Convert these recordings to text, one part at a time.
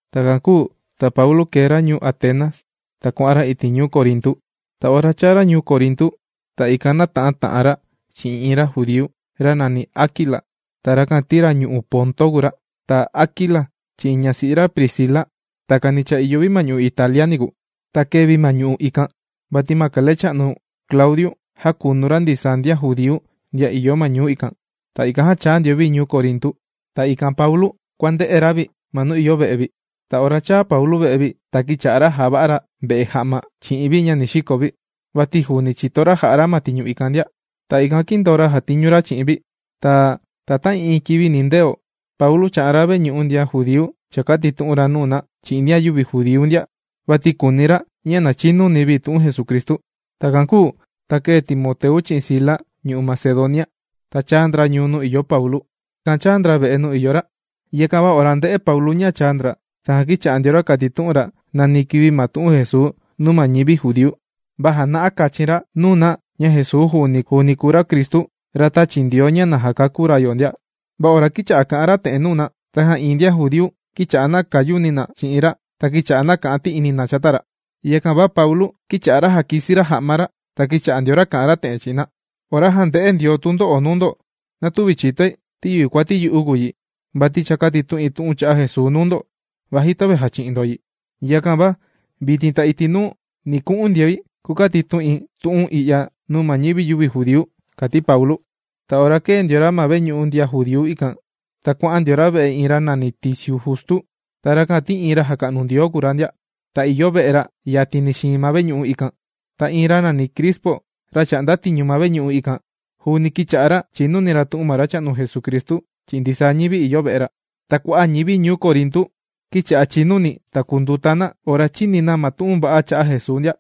Takan kūu ta Paulu, kēe ra ñuu Atenas, ta kuà'an ra iti' ñuu Corintu. Ta ora chāa ra ñuu Corintu ta ikan nāta'an ta'an ra chi'in iin ra judíu, ra nàni Aquila. Ta rakan ti ra ñu'u' Ponto kùu ra. Ta Aquila chi'in ñasi'i ra Priscila, takani cha ìyo vi ma ñu'u' Italia niku. Ta kēe vi ma ñu'u' ikan vati ma ra kalecha'nu Claudiu, jākunu ra ndisaa ndian judíu ndian ìyo ma ñu'u' ikan. Ta ikan já chāa ndio vi ñuu Corintu. Ta ikan Paulu kuà'an ra kuànde'e ra vi ma nuu ìyo ve'e vi. Ta ora chāa Paulu ve'e vi, ta kīcha'a ra jàva'a ra ve'e ja'ma chi'in vi ña ni xiko vi. Vati juuni chìto ra jà'a ra ma tiñu ikan ndia. Ta ikan kīndoo ra jàtiñu ra chi'in vi. Ta ta'ii'iin kivi nindeo Paulu chà'an ra ma veñu'u ndian judíu chàkatitu'un ra nuu na chi'in ndian yüvi judíu ndia, vati kùuni ra ña na chinuni na tu'un Jesucristu. Takan kūu ta kēe Timoteu chi'in Sila ñu'u' Macedonia, ta chāa ndra ñuu nuu ìyo Paulu. Ta ikan chāa ndra ve'e nuu ìyo ra. Yakan va ora ndē'e Paulu ña chāa ndra, tajan kīcha'a ndio ra kàtitu'un ra nani kivi ma tu'un Jesuu nuu ma ñivi judíu, va jàna'a kachin ra nuu na ña Jesuu juuni kùu ra ma Cristu ra tāchi Ndioo ña na jakakú ra yo ndia. Va ora kīcha'a ra kà'an ra te'en nuu na, tajan iin ndian judíu kīcha'a na kàyuni na chi'in ra ta kīcha'a na kà'an ti'ini na chata ra. Yakan va Paulu kīcha'a ra jàkisi ra ja'ma ra, ta kīcha'a ndio ra kà'an ra te'en chi'in na: ―Ora jànde'e Ndioo tundo'o nuu ndo na tüva chìtoi ti yüva kuati yu'u kùu yi, vati cha kātitu'in tu'un cha'a' Jesuu nuu ndo vaji töve jàchi'in ndo yi. Yakan va vitin ta iti' nuu ni ku'un ndioi kukatitu'in tu'un i'ya nuu ñivi yüvi judíu ―kàti Paulu. Ta ora kēe ndio ra ma veñu'u ndian judíu ikan, ta kuà'an ndio ra ve'e iin ra nàni Ticio Justo, ta rakan ti iin ra jàka'nu Ndioo kùu ra ndia. Ta ìyo ve'e ra yatini xiin ma veñu'u ikan. Ta iin ra nàni Crispo, ra chà'nda tiñu ma veñu'u ikan juuni kīcha'a ra chìnuni ra tu'un ma Racha'nu Jesucristu chi'in ndisaa ñivi ña ìyo ve'e ra. Ta kua'a' ñivi ñuu Corintu kīcha'a chìnuni ta kùnduta na ora chīni na ma tu'un va'a cha'a' Jesuu ndia.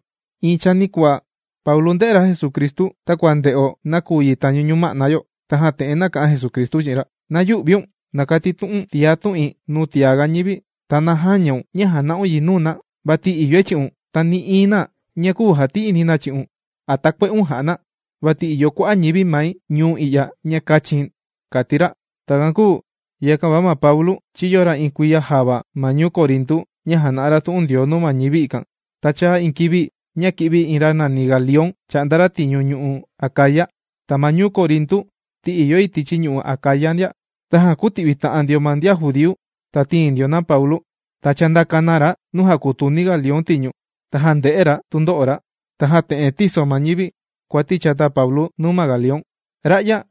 Iin chanikuaa Paulu ndē'e ra Jesucristu takua ndē'o nakuyi tañu ñuma'na yo. Tajan te'en nāka'an Jesucristu chi'in ra: ―¡Na yü'viun! ¡Na katitu'u̱n tiá tu'in nuu tiaga ñivi! ¡Ta na jäñaun ña jàna'un yi nuu na! Vati ìyoi chi'un, ta nï'iin na küu jati'ini na chi'un a takue'un jà'a na, vati ìyo kua'a' ñivi mai ñuu i'ya ña kāchi̱n ―kàti ra. Takan kūu yakan va Paulu chīyo ra iin kuiya java ma ñuu Corintu ña jàna'a ra tu'un Ndioo nuu ma ñivi ikan. Ta chāa iin kivi ña kī'vi ra nàni Galión chà'nda ra tiñu ñu'u' Acaya. Ta ma ñuu Corintu ti ìyo yi tichi ñu'u' Acaya ndia, tajan kūti'vi ta'an ndio ma ndian judíu, ta tīin ndio na Paulu. Ta chāndaka na ra nuu jàkutuni Galión tiñu, na jànde'e ra tundo'o ra. Tajan te'en tīso ma ñivi kuati chata Paulu nuu ma Galión: ―Ra'ya,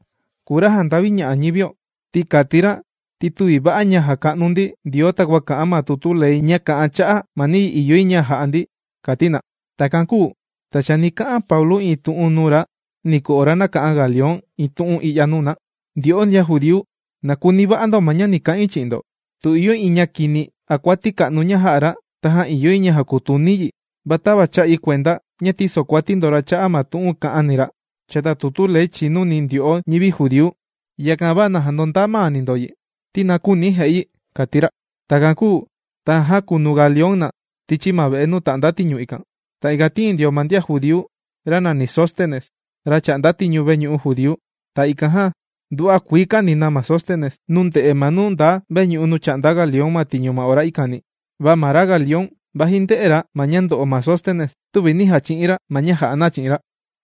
kùu ra jànda'viña'a ñivio. Ti kàti ra ti tüvi va'a ña jàka'nu ndi Ndioo takua kà'an ma tutu ley ña kà'an cha'a' ma niyi ìyo yi ña ja'a ndi ―kàti na. Takan kūu ta chani ka'an Paulu iin tu'un nuu ra niku ora nāka'an Galión iin tu'un i'ya nuu na: ―Ndyo'o ndian judíu, na kuni va'a ndo ña ni ka'in chi'in ndo. Tu ìyo iin ña kini a kuati ka'nu ña jā'a ra, tajan ìyo yi ña jakutuni̱ yi, va tava chā'i kuenda ña tìsokuati ndo ra cha'a' ma tu'un kā'ani ra chata tutu Ley chìnuni ndyo'o ñivi judíu, yakan va na jandondaa maani ndo yi ti na küuni ja'i yi ―kàti ra. Takan kūu tajan jākunu Galión na tichi ma ve'e nuu tà'nda tiñu ikan. Ta ikan tīin ndio ma ndian judíu ra nàni Sóstenes, ra chà'nda tiñu veñu'u judíu. Ta ikan jan nduva'a kuii kāni na ma Sóstenes nuu nde'e ma nuu nda vetiñu nuu chà'nda Galión ma tiñu ma ora ikani. Va ma Galión, vaji ndē'e ra ma ña ndo'o ma Sóstenes, tüvi nī jachi'in ra ma ña jà'a na chi'in ra.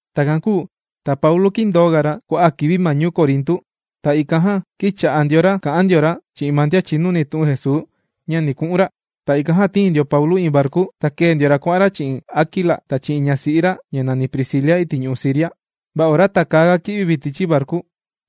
Takan kūu ta Paulu kīndooga ra kua'a' kivi ma ñuu Corintu. Ta ikan jan kīcha'a ndio ra kà'an ndio ra chi'in ma ndian chìnuni tu'un Jesuu ña ni ku'un ra. Ta ikan jan tīin ndio Paulu iin varku. Ta kēe ndio ra kuà'an ra chi'in Aquila ta chi'in ñasi'i ra ña nàni Priscila iti' ñu'u' Siria. Va ora takäaga ki'vi vi tichi varku,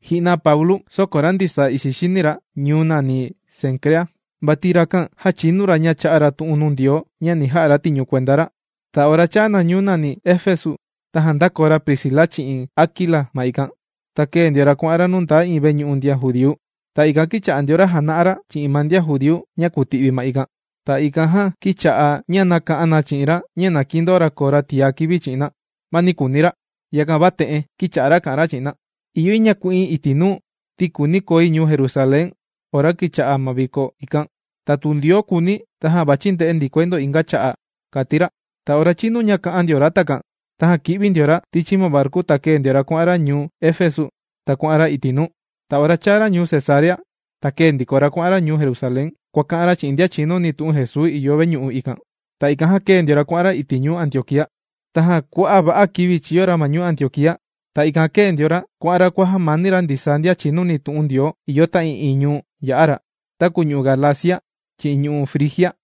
ji'na Paulu sōkon ra ndisaa ixi xini ra ñuu nàni Cencrea. Vati rakan jāchinu ra ña chā'a ra tu'un nuu Ndioo ña ni ja'a ra tiñu kuenda ra. Ta ora chāa na ñuu nàni Efesu, tajan ndākoo ra Priscila chi'in Aquila ma ikan. Ta kēe ndio ra kuà'an ra nuu ndaa iin veñu'u ndian judíu. Ta ikan kīcha'a ndio ra jàna'a ra chi'in ma ndian judíu ña kùti'vi ma ikan. Ta ikan jan kīcha'a ña nàka'an na chi'in ra ña na kindoo ra koo ra tiá kivi chi'in na, va nī kuuni ra. Yakan va te'en kīcha'a ra kà'an ra chi'in na: ―Ìyo yi ña ku'in iti' nuu ti kùuni koi ñuu Jerusalén ora kicha'a ma viko ikan. Ta tu Ndioo kùuni, tajan vàchi̱ nde'e ndikoi ndo inga cha'a' ―kàti ra. Ta ora chīnu kà'an ra takan tajan kī'vi ndio ra tichi ma varku ta kēe ndio ra ñuu Efesu ta kuà'an ra iti' nuu. Ta ora chāa ra ñuu Cesarea, ta kēe ndiko ra kuà'an ra ñuu Jerusalén, kuàka'an ra chi'in ndian chìnuni tu'un Jesuu ìyo veñu'u ikan. Ta ikan jan kēe ndio ra kuà'an ra iti' ñuu Antioquía. Tajan kua'a' va'a kivi chīyo ra ma ñuu Antioquía, ta ikan jan kēe ndiko ra kuà'an ra kuàjamani ra ndisaa ndian chìnuni tu'un Ndioo ìyo ta'ii'iin ñuu nuu yā'a ra, taku ñu'u' Galacia chi'in ñu'u' Frigia.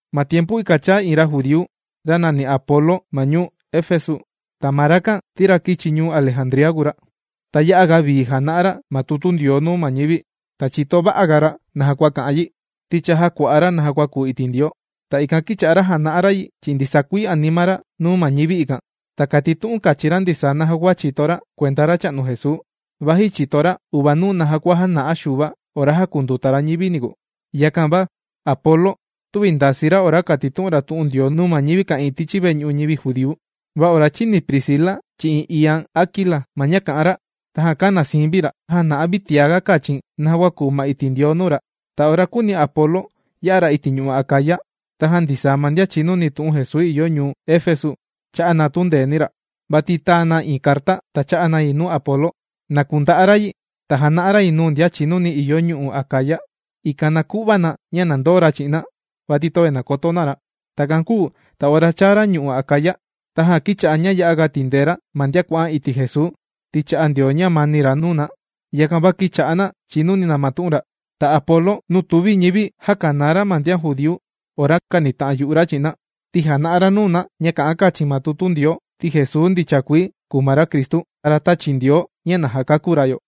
Ma tiempu ikan chāa iin ra judíu, ra nàni Apolo ma ñuu Efesu. Ta ma rakan ti ra kìchi ñuu Alejandría kùu ra. Ta ya'a ga vii jàna'a ra ma tutu Ndioo nuu ma ñivi, ta chìto va'a ga ra naja kua kà'an yi. Ti cha jākua'a ra naja kua kùu iti' Ndioo, ta ikan kīcha'a ra jàna'a ra yi chi'in ndisaa kuii anima ra nuu ma ñivi ikan. Ta kàtitu'un kachin ra ndisaa naja kua chìto ra kuenda Racha'nu Jesuu, vaji chìto ra uvanuu naja kua jāna'a Xuva ora jākunduta ra ñivini niku. Yakan va Apolo tüvi ndasii ra ora kàtitu'un ra tu'un Ndioo nuu ñivi ka'ìin tichi veñu'u ñivi judíu. Va ora chīni Priscila chi'in iian Aquila ma ña kà'an ra, tajan kāna siin vi ra, ta jāna'a vi tiaga kachin naja kua kùu ma iti' Ndioo nuu ra. Ta ora kūuni Apolo ya'a ra iti' ñu'u' Acaya, tajan ndisaa ma ndian chìnuni tu'un Jesuu ìyo ñuu Efesu, chā'a na tundeeni ra. Vati tāa na iin carta ta chā'a na yi nuu Apolo, na kunda'a ra yi ta jana'a ra yi nuu ndian chìnuni ìyo ñu'u' Acaya, ikan na ku'va na ña na ndoo ra chi'in na, vati töve nàkoto na ra. Takan kūu ta ora chāa ra ñu'u' Acaya, tajan kīcha'a ña ya'a ga tìndee ra ma ndian kuà'an iti' Jesuu, ti chā'a Ndioo ñamani ra nuu na, yakan va kīcha'a na chìnuni na ma tu'un ra. Ta Apolo, nuu tùvi ñivi jākanaa ra ndian judíu ora kànita'an yu'u ra chi'in na, ti jàna'a ra nuu na ña kà'an kachin ma tutu Ndioo, ti Jesuu ndicha kuii kùu ma ra Cristu, ra tāchi Ndioo ña na jakakú ra yo.